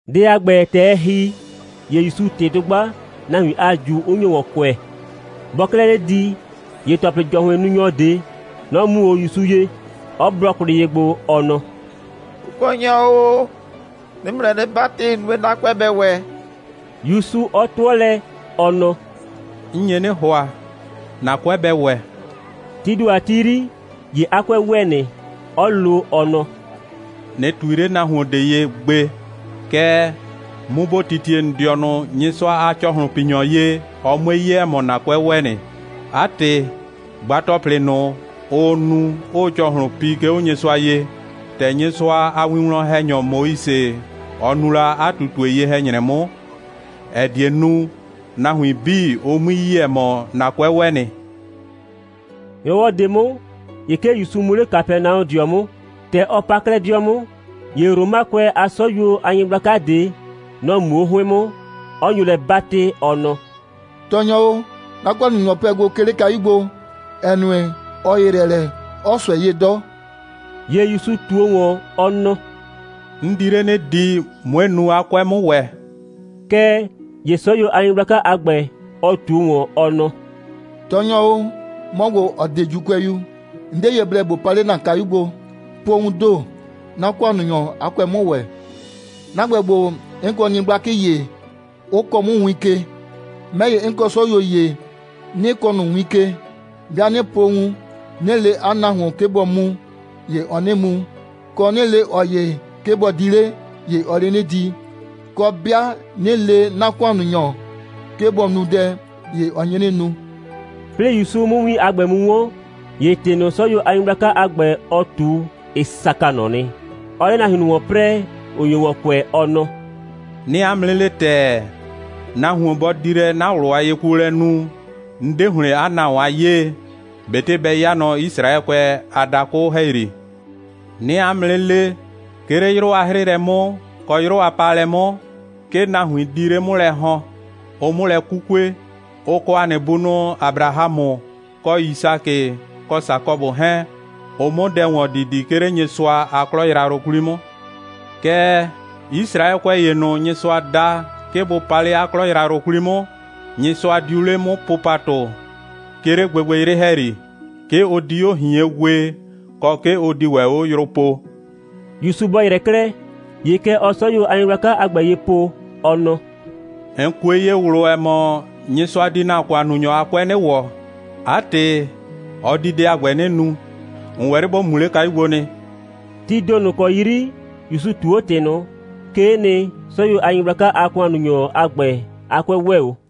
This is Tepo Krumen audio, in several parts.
Dɛ a ‑gbɛ, ‑tɛ ɛ ‑hi, ‑ye ‑Yusuu ꞊tɩ dʋgba, nahuin a ꞊ju 'ʋ nyo ‑wɔn kʋɛ. Bɔɔ 'klɛɛ 'le di, ‑ye ‑tɔplɩ‑jɔhʋɩnnunyɔ ꞊de, nɔ‑ mu 'o ‑Yusu ye, 'ɔ blɔ kwlɩ ye gbo, ɔ nɔ: «Kʋkɔnyɔ o, 'nɩɩ ‑mʋ lɛ 'nɩ 'batɩ, nue, 'na 'kʋɛ bɛ ‑wɛ!» ‑Yusu 'ɔ 'tʋɔ lɛ, ɔ nɔ: «'N nye 'nɩ ‑hʋa, ‑na 'kʋɛ bɛ ‑wɛ.» Tii ‑do a ti 'yri, ‑ye 'a 'kʋɛ ‑wɛ nɩ, 'ɔ lo, ɔ nɔ: «꞊Nɩ ꞊tui 'le nahuon ꞊de ye gbe! Kɛɛ, mu ‑bo titie ‑n dɩɔnʋ Nyɩsʋa a ‑cɔhlʋnpinyɔ ye, ɔ 'mue 'ye, ‑ɛ mɔ, ‑na 'kʋɛ ‑wɛ nɩ. 'A ‑tɩ, gba ‑tɔplɩ ꞊nʋ, ʋʋ nu, 'ʋʋ ‑cɔhlʋn pi, 'ke 'o Nyɩsʋa ye, ‑tɛ Nyɩsʋa a winwlɔn‑hɛnyɔ Moise, ɔ nu la 'a ꞊tutue ye‑hɛ‑nyrɛ 'mʋ, ‑ɛ die nu, nahuin 'bii, ʋ 'mui yi, ‑ɛ mɔ, ‑na 'kʋɛ ‑wɛ nɩ!» ‑Nyrɔwɔ ꞊de 'mʋ, ‑ye 'ke ‑Yusu mu 'le Kapɛnaɔdɩɔ 'mʋ. ‑Tɛ ɔ pa 'klɛɛ 'dɩɔ 'mʋ, ‑ye Romakʋɛ a 'sɔyuo a nyɩgblaka ꞊de, nɔ‑ muo 'o 'hʋɩn 'mʋ, 'ɔ nyo lɛ 'batɩ, ɔ nɔ: «Tɔɔnyɔ o, 'na ‑kʋannunyɔ pɛ gbo, 'ke 'le kayu gbo, ‑ɛ nue, ɔ ‑yɩyrɛ lɛ, 'ɔɔ ꞊sʋɛ 'ye 'dɔ.» ‑Ye ‑Yusu ꞊tuo ‑wɔn, ɔ nɔ: «'N di 'le 'nɩ di, 'mue nu, 'a 'kʋɛ 'mʋ ‑wɛ.» Kɛɛ ‑ye 'sɔyuo a nyɩgblaka a ‑gbɛ, ɔ ꞊tuo ‑wɔn, ɔ nɔ: «Tɔɔnyɔ o, 'mɔ ‑gbo, ‑ɔ 'de ‑Juukʋɛyu, 'n 'de ye blɛ ‑bo pa 'le 'na kayu gbo. Po wuun ‑do, 'na ‑kʋannunyɔ a 'kʋɛ 'mʋ ‑wɛ. 'Na ‑gbɛ ‑gbo, 'n kɔ nyɩgblakɩ ‑ye, 'ʋ kɔɔ 'mʋ win ke. 'Mɛ ‑ye, 'n kɔ 'sɔyuo ‑ye, 'nɩ kɔɔ ꞊nʋ win ke. 'Bɩa 'nɩ po wun, 'nɩ le 'a nahuon, 'ke bɔ mu, ‑ye ɔɔ 'nɩ mu, kɔ, 'nɩ le ꞊ɔ ‑ye, 'ke bɔ di 'le, ‑ye ɔɔ 'le 'nɩ di. Kɔ, 'bɩa 'nɩ le 'na ‑kʋannunyɔ, 'ke bɔ nu dɛ, ‑ye ɔ nye 'nɩ nu.» 'Plɩɩ ‑Yusu 'mʋ win a ‑gbɛ mu 'wɔn, ‑ye ‑tɩ ꞊nʋ, 'sɔyuo a nyɩgblaka a ‑gbɛ, ɔ ꞊tu, ɩ saka ꞊nɔ nɩ, 'ɔɔ 'le nahuin ꞊nʋ ‑wɔn 'prɛɛ, ‑ʋ nyo ‑wɔn kʋɛ, ɔ nɔ: «'Nɩɩ 'a mʋ 'nɩ le ‑tɛɛ, nahuon, bɔ di lɛ 'na ꞊wlʋ a yekuolɛ nu, 'n 'de ‑hlɩn 'a nahuon a 'yee, ꞊betɩ bɛ 'ya nɔ Yisraɛkʋɛ a dakʋ ‑hɛyri. 'Nɩɩ 'a mʋ 'nɩ 'le, 'ke 'le 'yrʋ a 'hrɩɩlɛ 'mʋ, kɔ 'yrʋ a paalɛ 'mʋ, 'ke nahuin di 'le 'mʋ lɛ ‑hɔn, ʋ 'mʋ lɛ 'kukue, ʋ kɔ ‑a nɩ bunʋ Abrahamʋ, kɔ Yisakɩ, kɔ Sakɔbʋ 'hɛɛn, ʋ 'mʋ dɛ ‑wɔn didi, 'ke 'le Nyɩsʋa a 'klɔ yrayrʋ 'kwli 'mʋ. Kɛɛ, Yisraɛkʋɛ ‑ye ꞊nʋ, Nyɩsʋa da, 'ke bʋ pa 'le 'a 'klɔ yrayrʋ ꞊nʋ 'kwli 'mʋ, Nyɩsʋa diu 'le 'mʋ po ‑patʋ, 'ke 'le gbɩgbɩyrɩ ‑hɛyri. 'Ke ʋ di 'o ꞊hien wee, kɔ, 'ke ʋ di ‑wɛ 'o yrʋ poo.» ‑Yusu bɔ ‑yrɛ 'klɛɛ, ‑ye kɛ ɔɔ 'sɔyuo a nyɩgblaka a ‑gbɛ ye po, ɔ nɔ: «‑N kue ye ꞊wlʋ, ‑ɛ mɔ, Nyɩsʋa di ‑na ‑kʋannunyɔ a 'kʋɛ 'nɩ ‑wɔ. 'A ‑tɩ, ɔ di dɛ a ‑gbɛ 'nɩ nu. ‑N ‑wɛ 'le ‑bo mu 'le kayu gbo nɩ.» Tii ‑do ꞊nʋ ‑kɔ 'yri ‑Yusu ꞊tuu 'o ‑tɩ ꞊nʋ, 'kee nɩ, 'sɔyuo a nyɩgblaka a ‑kʋannunyɔ a ‑gbɛ a 'kʋɛ ‑wɛɛ 'o.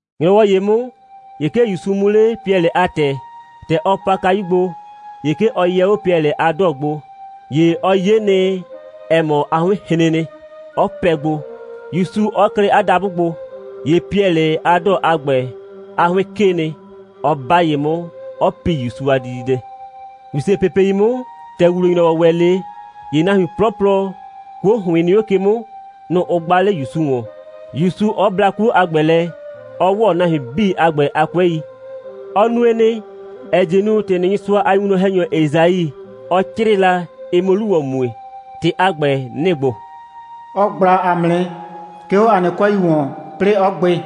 ‑Nyrɔwɔ ‑ye 'mʋ, ‑ye 'ke ‑Yusu mu 'le Piɛlɩ a ‑tɛ. ‑Tɛ ɔ pa kayu gbo, ‑ye 'ke ɔ yɛ 'o Piɛlɩ a 'dɔɔ gbo. ‑Ye ɔ 'ye nɩ, ‑ɛ mɔ, 'a 'hʋɩn hren nɩ, 'ɔ pɛ gbo, ‑Yusu 'ɔ klɩ 'a dabʋ gbo. ‑Ye Piɛlɩ a 'dɔɔ a ‑gbɛ, 'a 'hʋɩn 'kee nɩ, 'ɔ 'ba ye 'mʋ, 'ɔ pi ‑Yusu a dididɛ. ‑Wisepepei 'mʋ, ‑tɛ ‑wuwle‑nyrɔwɔ ‑wɛ 'le, ‑ye nahuin 'plɔplɔ, 'kuo ‑hʋɩn nɩ 'o ke 'mʋ, nʋ‑ ʋ gba 'le ‑Yusu ‑wɔn, ‑Yusu 'ɔ bla 'kuo a ‑gbɛ lɛ, 'ɔ ‑wɔ nahuin 'bii a ‑gbɛ a 'kʋɛi. Ɔ nue nɩ, ‑ɛ die nu, ‑tɩ ꞊nʋ, Nyɩsʋa a winwlɔn‑hɛnyɔ Esai, ɔ 'crɩɩ la, ɩ 'mʋ 'lu ‑wɔn mue. ‑Tɩ a ‑gbɛ, nɩ‑ ‑gbo: «Ɔ ꞊gbla ‑a mʋ nɩ, 'ke 'o ‑a nɩ 'kʋɛi ‑wɔn, 'plɩɩ 'ɔ gbɩ.»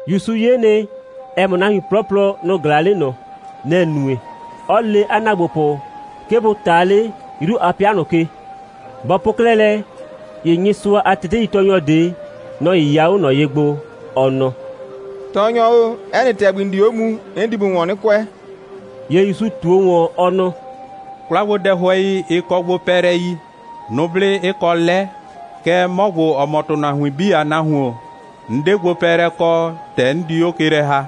‑Yusu 'ye nɩ, ‑ɛ mɔ, nahuin 'plɔplɔ, nʋ‑ ꞊glaa 'le ꞊nɔ. Nɛ‑ nue, 'ɔ le 'a ‑naagbopʋ, 'ke bʋ ꞊ta 'le 'yru a 'pɩa ꞊nʋ ke. Bɔ po 'klɛɛ lɛ, ‑ye Nyɩsʋa a teteitɔɔnyɔ ꞊de, nɔ‑ 'yɩya 'o ꞊nɔ ye gbo, ɔ nɔ: «Tɔɔnyɔ o, 'ɛ nɩ ‑tɛgbi, ‑n di 'o muu, 'n di ‑mʋ ‑wɔn 'nɩ kʋɛ.» ‑Ye ‑Yusu ꞊tuo ‑wɔn, ɔ nɔ: «'Kwlagbodɛhʋɛi, ɩ kɔ gbopɛɛlɛi, nʋblɩ 'ɩ kɔ 'lɛ, kɛɛ, 'mɔ ‑gbo, ‑ɔ mɔ ‑tʋnahuin 'bii a Nahuon, 'n 'de gbopɛɛlɛ kɔ, ‑tɛ 'n di 'o ke lɛ ‑ha.»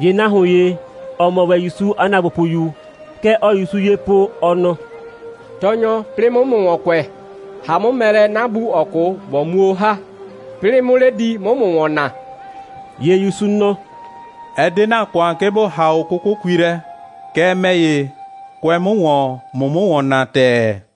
‑Ye nahuon ‑ye, ‑ɔ mɔ ‑wɛ ‑Yusu a ‑naagbopʋyu, kɛ ɔɔ ‑Yusu ye po, ɔ nɔ: «Tɔɔnyɔ, 'plɩɩ 'mʋ ‑mʋ ‑wɔn kʋɛ, ‑ha 'mʋ mɛ lɛ, 'na bu, ‑ɔ 'kʋ, ꞊bo muo 'o ‑ha, 'plɩɩ 'mʋ 'le di, 'mʋ ‑mʋ ‑wɔn naa.» ‑Ye ‑Yusu nɔ: «Ɛ 'de ‑na ‑kʋan, 'ke ‑bo ‑ha 'o 'kʋkʋkui lɛ. Kɛɛ, ‑mɛ ‑ye, kʋɛ 'mʋ ‑wɔn, ꞊mʋ 'mʋ ‑wɔn naa ‑tɛɛ!»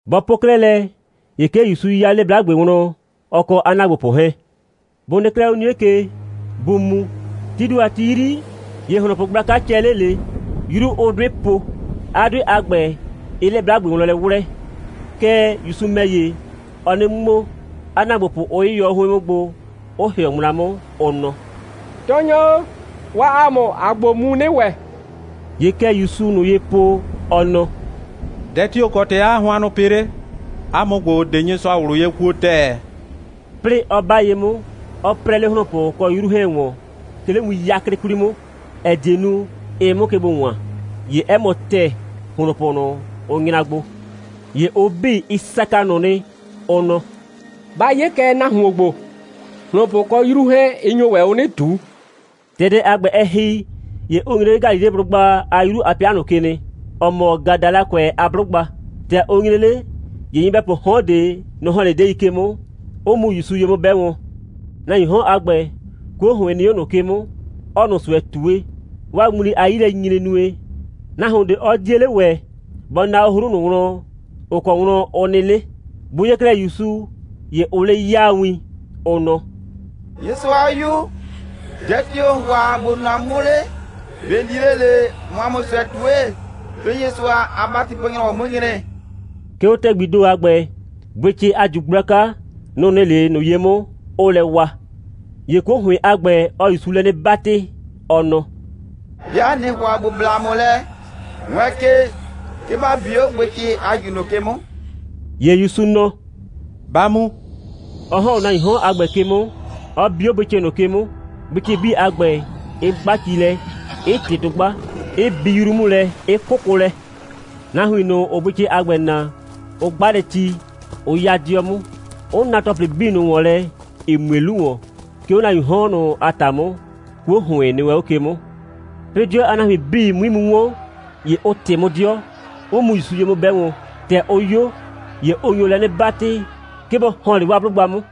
Bɔ po 'klɛɛ lɛ, ‑ye 'ke ‑Yusu 'ya 'le 'blagbe wlɔn, ɔ kɔ 'a ‑naagbopʋ 'hɛɛn. Bʋ nɩ 'klɛɛ 'o 'nie ke, bʋʋ mu, tii ‑do a ti 'yri, ‑ye ‑hlonpʋ gblaka cɛ 'le ꞊le, 'yru 'ʋʋ 'dʋɩ po, 'a 'dʋɩ a ‑gbɛ 'ɩɩ 'le 'blagbe wlɔn lɛ 'wlɛɛ. Kɛɛ, ‑Yusu ‑mɛ ‑ye, ɔɔ 'nɩ ŋmo, 'a ‑naagbopʋ 'ʋ 'yɩyɔ 'o 'hʋɩn 'mʋ gbo, 'ʋ ‑hɩɔ ŋmla 'mʋ, ʋ nɔ: «Tɔɔnyɔ o, waa ‑a mʋ, ‑aa gbo mu 'nɩ ‑wɛ.» ‑Ye kɛ ‑Yusuu ꞊nʋ ye po, ɔ nɔ: «Dɛ tio‑ kɔ ‑tɩ 'aa hʋannʋ pɩ 'le? 'A mʋ ‑gbo, ‑ʋ 'de Nyɩsʋa ꞊wlʋ ye kuo ‑tɛɛ?» 'Plɩɩ 'ɔ 'ba ye 'mʋ, 'ɔ 'prɛɛ 'le ‑hlonpʋ kɔ 'yru 'hɛɛn ‑wɔn, 'ke 'le win 'yaklɩ 'kwli 'mʋ, ‑ɛ die nu, ɩ 'mʋ ke gbo ‑wan, ‑ye 'ɛ mɔ ‑tɛɛ, ‑hlonpʋ ꞊nʋ, ʋ nyra gbo. ‑Ye ʋ 'bii, ɩ saka ꞊nʋ nɩ, ʋ nɔ: «Ba 'ye kɛ nahuon ‑gbo, ‑hlonpʋ kɔ 'yru 'hɛɛn, ɩ nyo ‑wɛ 'o 'nɩ ꞊tuu.» ‑Tɛ dɛ a ‑gbɛ, ɛ ‑hi, ‑ye ʋ nyre 'le Galileblʋgba a 'yru a 'pɩa ꞊nʋ ke nɩ, ‑ɔ mɔ Gadalakʋɛ a 'blʋgba. ‑Tɛ ʋ nyre 'le, ‑ye nyɩbɛpʋʋ 'hɔn ꞊de, nʋ‑ ‑hɔn 'le 'dɛɛi ke 'mʋ, 'ʋ mu ‑Yusu ye 'mʋ 'bɛ wɔn. Nahuiin 'hɔn a ‑gbɛ, 'kuo ‑hʋɩn nɩ 'o ꞊nʋ 'ke 'mʋ, 'ɔɔ ꞊nʋ ꞊sʋɛ ꞊tue. 'Waa ŋmli a 'yilɛnyinyre nue, nahuon ꞊de 'ɔ 'die 'le ‑wɛ bɔ na 'o 'hru ꞊nʋ wlɔn, ‑ʋ kɔ wlɔn ʋ nɩ 'le. Bʋ 'ye 'klɛɛ ‑Yusu, ‑ye ʋʋ 'le 'yaa win, ʋ nɔ: «Nyɩsʋa a 'Yu, dɛ tio‑ ‑n ‑hʋa ‑bo nu ‑a mʋ 'mʋ 'le? ꞊Be ‑n di 'le ꞊le, ꞊mʋ ‑a mʋ ꞊sʋɛ ꞊tue, 'plɩɩ Nyɩsʋa a ‑batipo‑nyrɔwɔ 'mʋ 'o nyre?» 'Ke 'o ‑tɛgbii ‑do a ‑gbɛ, bʋɩcɩ a ꞊ju gblaka, nʋ‑ nɩ 'le ꞊nʋ ye 'mʋ, 'ʋʋ lɛ wa. ‑Ye 'kuo ‑hʋɩn a ‑gbɛ, ɔɔ ‑Yusu lɛ 'nɩ 'batɩ, ɔ nɔ: «'Bɩa ꞊nɩɩ ‑hʋa ‑bo bla ‑a mʋ lɛ, wɛɛn ke, 'ke ‑ba bi 'o bʋɩcɩ a ꞊ju ꞊nʋ ke 'mʋ.» ‑Ye ‑Yusu nɔ: «Ba mu!» 'ɔ ‑hɔn 'o nahuiin 'hɔn a ‑gbɛ ke 'mʋ, 'ɔ bi 'o bʋɩcɩ ꞊nʋ ke 'mʋ, bʋɩcɩ 'bii a ‑gbɛ, 'ɩ 'gba ci lɛ, 'ɩ ꞊tɩ dʋgba, 'ɩ bi 'yru 'mʋ lɛ, 'ɩ 'kʋkʋ lɛ. Nahuin ꞊nʋ, ‑ʋʋ bʋɩcɩ a ‑gbɛ naa, ʋ 'gba lɛ ci, 'ʋ 'ya 'dɩɔ 'mʋ, 'ʋ na ‑tɔplɩ 'bii ꞊nʋ ‑wɔn lɛ, ‑ɩ mue 'lu ‑wɔn, 'ke 'o nahuiin 'hɔn ꞊nʋ a ‑ta 'mʋ, 'kuo ‑hʋɩn nɩ wɛn 'o ke 'mʋ. 'Plɩɩ 'dɩɔ a nahuin 'bii 'mui mu 'wɔn, ‑ye ʋ ꞊tɩ 'mʋ 'dɩɔ, 'ʋ mu ‑Yusu ye 'mʋ 'bɛ wɔn. ‑Tɛ ʋ 'yo, ‑ye ʋ nyo lɛ 'nɩ 'batɩ, 'ke bɔ ‑hɔn 'le 'waa 'blʋgba 'mʋ.